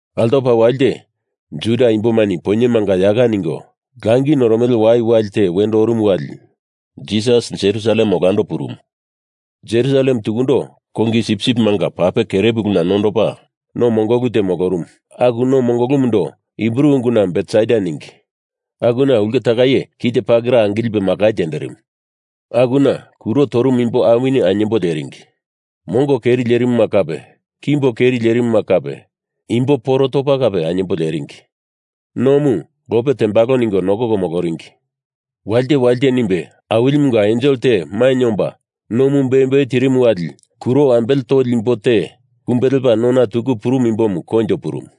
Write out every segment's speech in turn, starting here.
Altopa walite, Juda imbomani poinyemanga yaka ningo langi noromele wai awili te wendo orumu wali Jisas Jerusalem olando purumu. Jerusalem tukundo kongi sipsipimanga pape kere puluna nondopa, no mongolu te molorumu aku no mongolumundo Hibru unguna Betesda ningi, akuna ulke takai kite pakera angilipe makai terimu. Akuna kuro torumu imbo awini ainyembo leringi. Mongo keri lerimuma kape, kimbo keri lerimuma kape imbo poro topa kape ainyembo leringi. Nomu lope tembalo ningo nokoko moloringi. Walite walite nimbe Awilimunga ensel te mainye omba nomu beumbeu tirimu wali kuro ambele toli imbo te kumbe lepa nona tuku purumu imbomu koinjo purumu.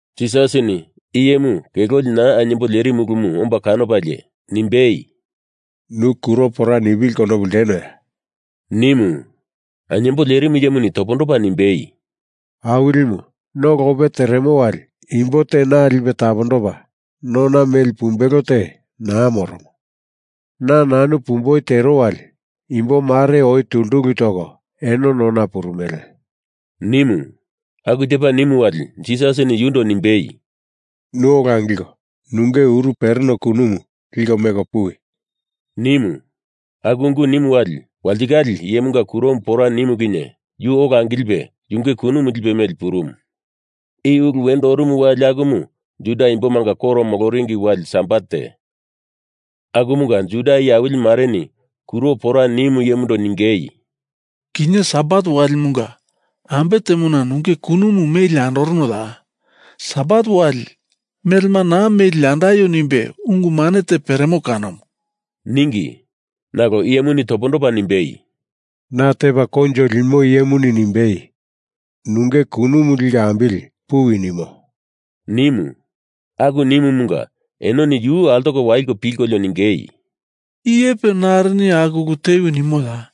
Jisasini iyemu kelolina ainyembo lerimu ulumu omba kanopalie, nimbei, “Nu kuro pora nipili konopu ltenoya?” nimu. Ainyembo lerimu iyemuni topondopa nimbei, “Awilimu, no lope teremo wali imbo te na lipe tapondopa nona meli pumbelo te naa moromo. Na nanu pumboi tero wali imbo mare oi tultuku toko eno nona purumele,” nimu. Aku tepa nimu wali Jisasini yundo nimbei, “Nu ola angilko nunge uru pereno kunumu liko meko puwi,” nimu. Aku ungu nimu wali, walitikale iyemunga kuromu pora nimu kinye yu ola angilipe yunge kunumu lipe meli purumu. I ulu wendo orumu wali akumu Juda imbomanga koro moloringi wali sabat te, akumunga Juda iye awili mareni kuro pora nimu iyemundo ningei, “Kinye Sabat walimunga ambe temona nunge kunumu meli andoronoya? Sabat wali melema naa meli andaio nimbe ungu mane te peremo kanomu,” ningi. Nalo iyemuni topondopa nimbei, “Na tepa koinjo limo iyemuni nimbei, nunge kunumu liko ambili puwi, nimo,” nimu. Aku nimumunga enoni yu altoko waliko pilkolio ningei, “Iyepe narini aku ulu tewi nimoya?”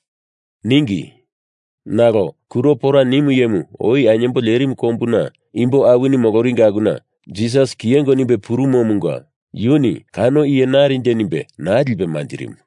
ningi. Nalo kuro pora nimu iyemu oi ainyembo lerimu kombuna imbo awini moloringi akuna Jisas kiyengo nimbe purumomunga yuni kano iye narinje nimbe naa lipe manjirimu.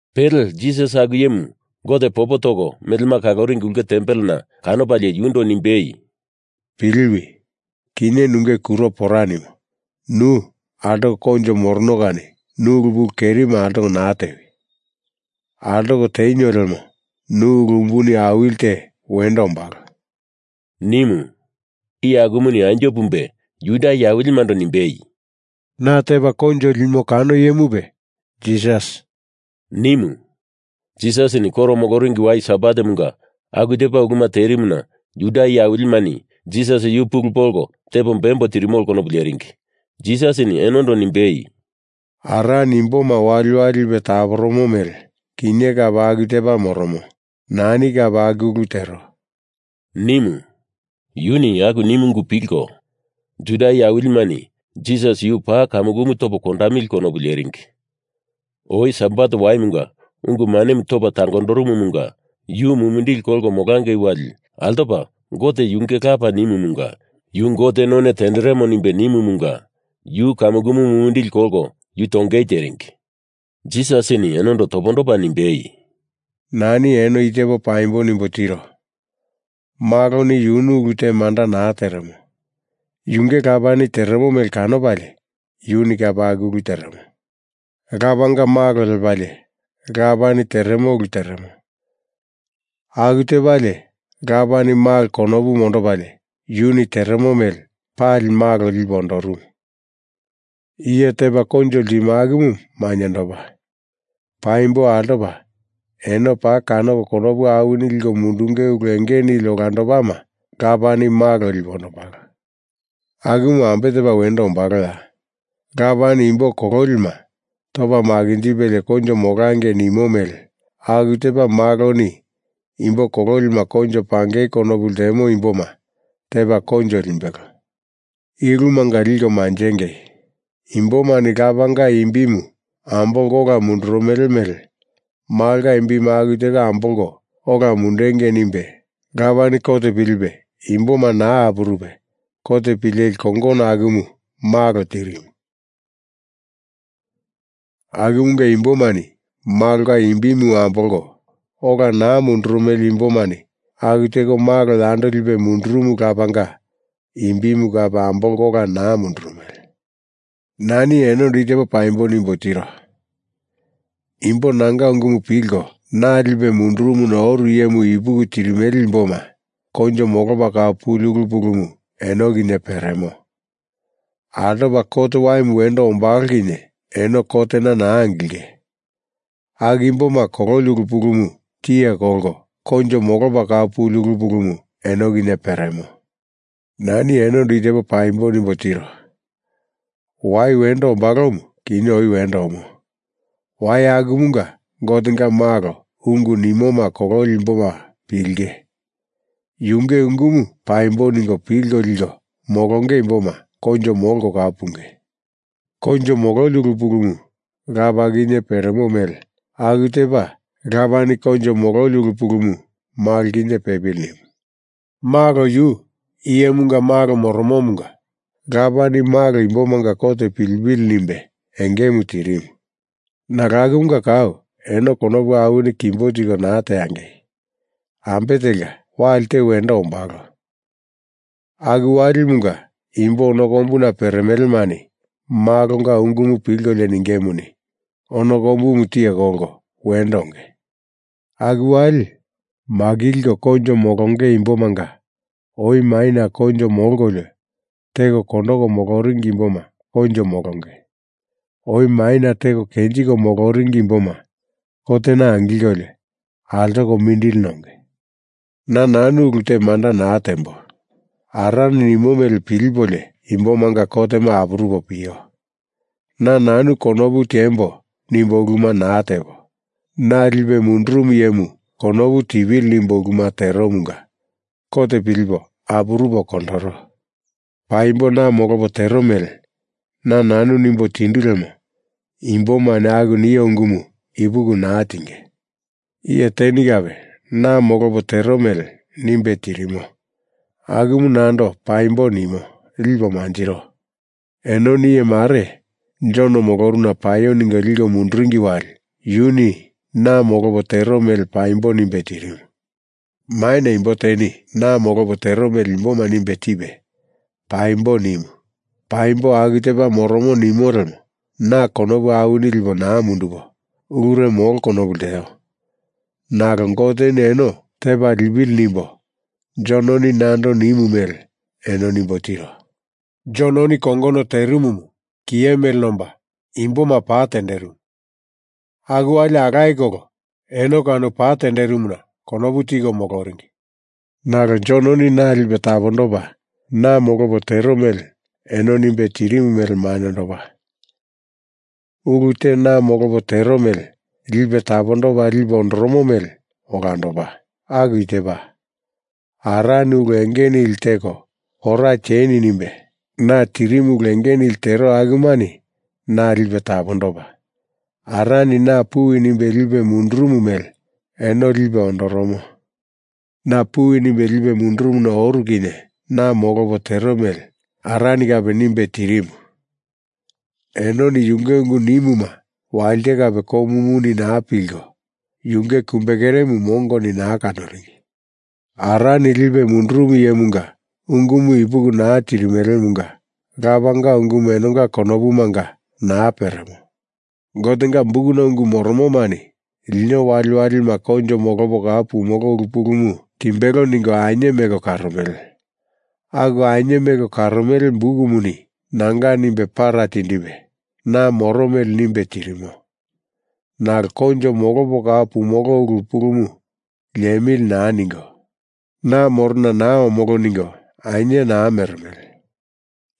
Pele Jisas aku iyemu Gote popo toko melema kaloringi ulke tempelena kanopalie yundo nimbei, “Piliwi! Kinye nunge kuro pora nimo nu altoko koinjo morono kani nu ulu pulu kerima altoko naa tewi! Altoko tenio lemo nu ulu umbuni awili te wendo ombalo,” nimu. Iye akumuni anjo pumbe Juda iye awilimando nimbei, “Na tepa koinjo limo kano iyemupe Jisas,” nimu. Jisasini koro moloringi wai Sabatemunga aku tepa uluma terimuna Juda iye awilimani Jisas yu pulu polko tepo bembo tirimolo konopu leringi. Jisasini enondo nimbei, “Arani imboma waliwali lipe taporomo mele kinye kape aku tepa moromo. Nani kape aku ulu tero,” nimu. Yuni aku nimu ungu pilko Juda iye awilimani Jisas yu paa kamukumu topo kondamili konopu leringi. Oi Sabat waimunga ungu manemu topa tangondorumumunga yu mumindili kolko molangei wali altopa Gote yunge Lapa nimumunga yu Gote none tenderemo nimbe nimumunga yu kamukumu mumindili kolko yu tongei teringi. Jisasini enondo topondopa nimbei, “Nani eno i tepo paimbo nimbo tiro. Maloni yunu ulu te manda naa teremo. Yunge Lapani teremo mele kanopalie yuni kape aku ulu teremo. Lapanga Malo lepalie Lapani teremo ulu teremo, aku tepalie Lapani Malo konopu mondopalie yuni teremo mele pali Malo lipe ondorumu. Iye tepa koinjo ltimo akumu mainyendopa. Paimbo altopa eno paa kanoko konopu awini liko mundunge ulu enge nili olandopama Lapani Malo lipe ondombalo. Akumu ambe tepa wendo ombaloya? Lapani imbo kololima topa makinjipelie koinjo molangei nimo mele aku tepa Maloni imbo kololima koinjo pangei konopu ltemo imboma tepa koinjo limbelo. I ulumunga liko manjengei: Imbomani Lapanga imbimu ambolko ola mundurumele mele Malonga imbimu aku teko ambolko ola mundengei nimbe Lapani kot pilipe imboma naa apurupe kot pileli kongono akumu Malo tirimu. Akumunga imbomani Malonga imbimu ambolko ola naa mundurumele imbomani aku teko Malo yando lipe mundurumu Lapanga imbimu kape ambolko ola naa mundurumele. Nani enondo i tepo paimbo nimbo tiro. Imbo nanga ungumu pilko, na lipe mundurumuna oru iyemu ipuki tirimele imboma koinjo molopa kau puli ulu pulumu eno kinye peremo. Altopa kot waimu wendo ombalo kinye eno kotena naa angilinge. Aku imboma kololi ulu pulumu tiye kolko koinjo molopa kau puli ulu pulumu eno kinye peremo. Nani enondo i tepo paimbo nimbo tiro. Wai wendo ombalomu, kinye oi wendo omo. Wai akumunga Gotenga Malo ungu nimoma kololi imboma pilinge. Yunge ungumu paimbo ningo pilko liko molonge imboma koinjo molko kau punge. Koinjo mololi ulu pulumu Lapa kinye peremo mele aku tepa Lapani koinjo mololi ulu pulumu Malo kinye pepili nimu. Malo yu Iyemunga Malo moromomunga Lapani Malo imbomanga kot pilipili nimbe engemu tirimu. Nalo akumunga kau eno konopu awini kimbo tiko naa tiengei! Ambe telka, wali te wendo ombalo, aku walimunga imbo ono kombuna peremelemani Malonga ungumu pilkolio ningemuni, ono kombumu tiye kolko wendo onge. Aku wali makilko koinjo molonge imbomanga oi maina koinjo molkolio teko kondoko moloringi imboma koinjo molonge, oi maina teko kenjiko moloringi imboma kotena angilkolio altoko mindili nonge. Na nanu ulu te manda naa tembo. Arani nimo mele pilipolio imbomanga kotema apurupo pio. Na nanu konopu tiembo nimbo uluma naa tepo, na lipe mundurumu iyemu konopu tipili nimbo uluma teromunga kot pilipo apurupo kondoro. Paimbo na molopo tero mele na nanu nimbo tindu lemo imbomani aku nio ungumu ipuki naa tinge. Iye teni kape na molopo tero mele nimbe tirimo, akumu nando paimbo nimo lipo manjiro. Enoni iye mare Jon molorumuna paio ningo liko munduringi wali yuni na molopo tero mele paimbo nimbe tirimu. Maina imbo teni na molopo tero mele imboma nimbe tipe paimbo nimu, paimbo aku tepa moromo nimo lemo na konopu awini lipo naa mundupo, ulure molo konopu lteo, nalo Goteni eno tepa lipili nimbo Jononi nando nimu mele eno nimbo tiro. Jononi kongono terimumu kiye mele nomba imboma pa tenderimu. Aku wali alaye kolo eno kano pa tenderimuna konopu tiko moloringi. Nalo Jononi na lipe tapondopa na molopo tero mele eno nimbe tirimu mele mainyendopa. Ulu te na molopo tero mele lipe tapondopa lipe ondoromo mele olandopa. Aku i tepa: Arani ulu enge nili teko pora tieni nimbe na tirimu ulu enge nili tero akumani na lipe tapondopa, Arani na puwi nimbe lipe mundurumu mele eno lipe ondoromo. Na puwi nimbe lipe mundurumuna oru kinye na molopo tero mele Arani kape nimbe tirimu. Enoni yunge ungu nimuma walite kape komomuni naa pilko, yunge kumbekeremu mongoni naa kanoringi. Arani lipe mundurumu iyemunga ungumu ipuki naa tirimelemunga lapanga ungumu enonga konopumanga naa peremo. Gotenga Bukuna ungu moromomani lino waliwalima koinjo molopo kau pumolo ulu pulumu timbelo ningo ainye meko karomele. Aku ainye meko karomele Bukumuni nanga nimbe para tindipe na moro mele nimbe tirimo, nalo koinjo molopo kau pumolo ulu pulumu liemili naa ningo, na morona naa omolo ningo ainye naa meremele.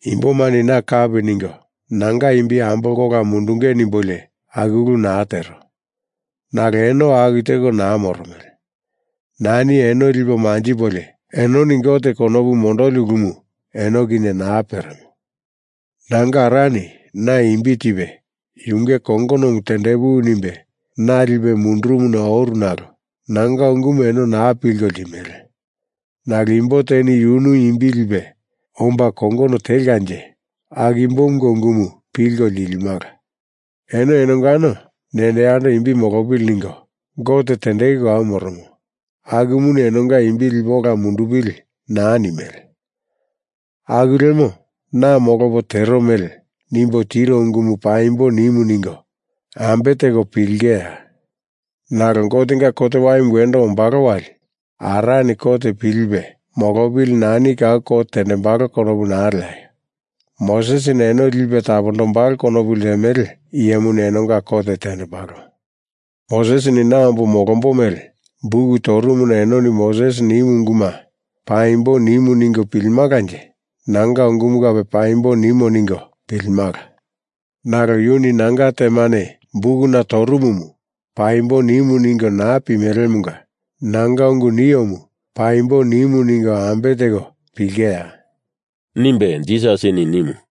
Imbomani na kapi ningo nanga imbi ambolko ola mundunge nimbolio aku ulu naa tero. Nalo eno aku teko naa moromele. Nani eno lipo manjipolio, enoni Gote konopu mondoli ulumu eno kinye naa peremo. Nanga Arani na imbi tipe yunge kongonomu tendepuwi nimbe na lipe mundurumuna oru nalo nanga ungumu eno naa pilko ltimele. Nalo imbo teni yunu imbi lipe omba kongono telkanje aku imbomunga ungumu pilko lilimala. Eno enongano nendo yando imbi molopili ningo, Gote tendeku kau moromo akumuni enonga imbi lipe ola mundundupili naa nimele, aku lemo na molopo tero mele nimbo tiro ungumu paimbo nimu ningo ambe teko pilingeya? Nalo Gotenga kot waimu wendo ombalo wali Arani kot pilipe molopili nani kau kot tendembalo konopu naa leaio! Mosesini eno lipe tapondombalo konopu ltemele iyemuni enonga kot tendembalo. Mosesini na ombo molombo mele buk torumuna enoni Mosesini nimu unguma paimbo nimu ningo pilimalanje nanga ungumu kape paimbo nimu ningo pilimala. Nalo yuni nanga temane bukuna torumumu paimbo nimu ningo naa pimelemunga nanga ungu niomu paimbo nimu ningo ambe teko pilingeya?” nimbe Jisasini nimu.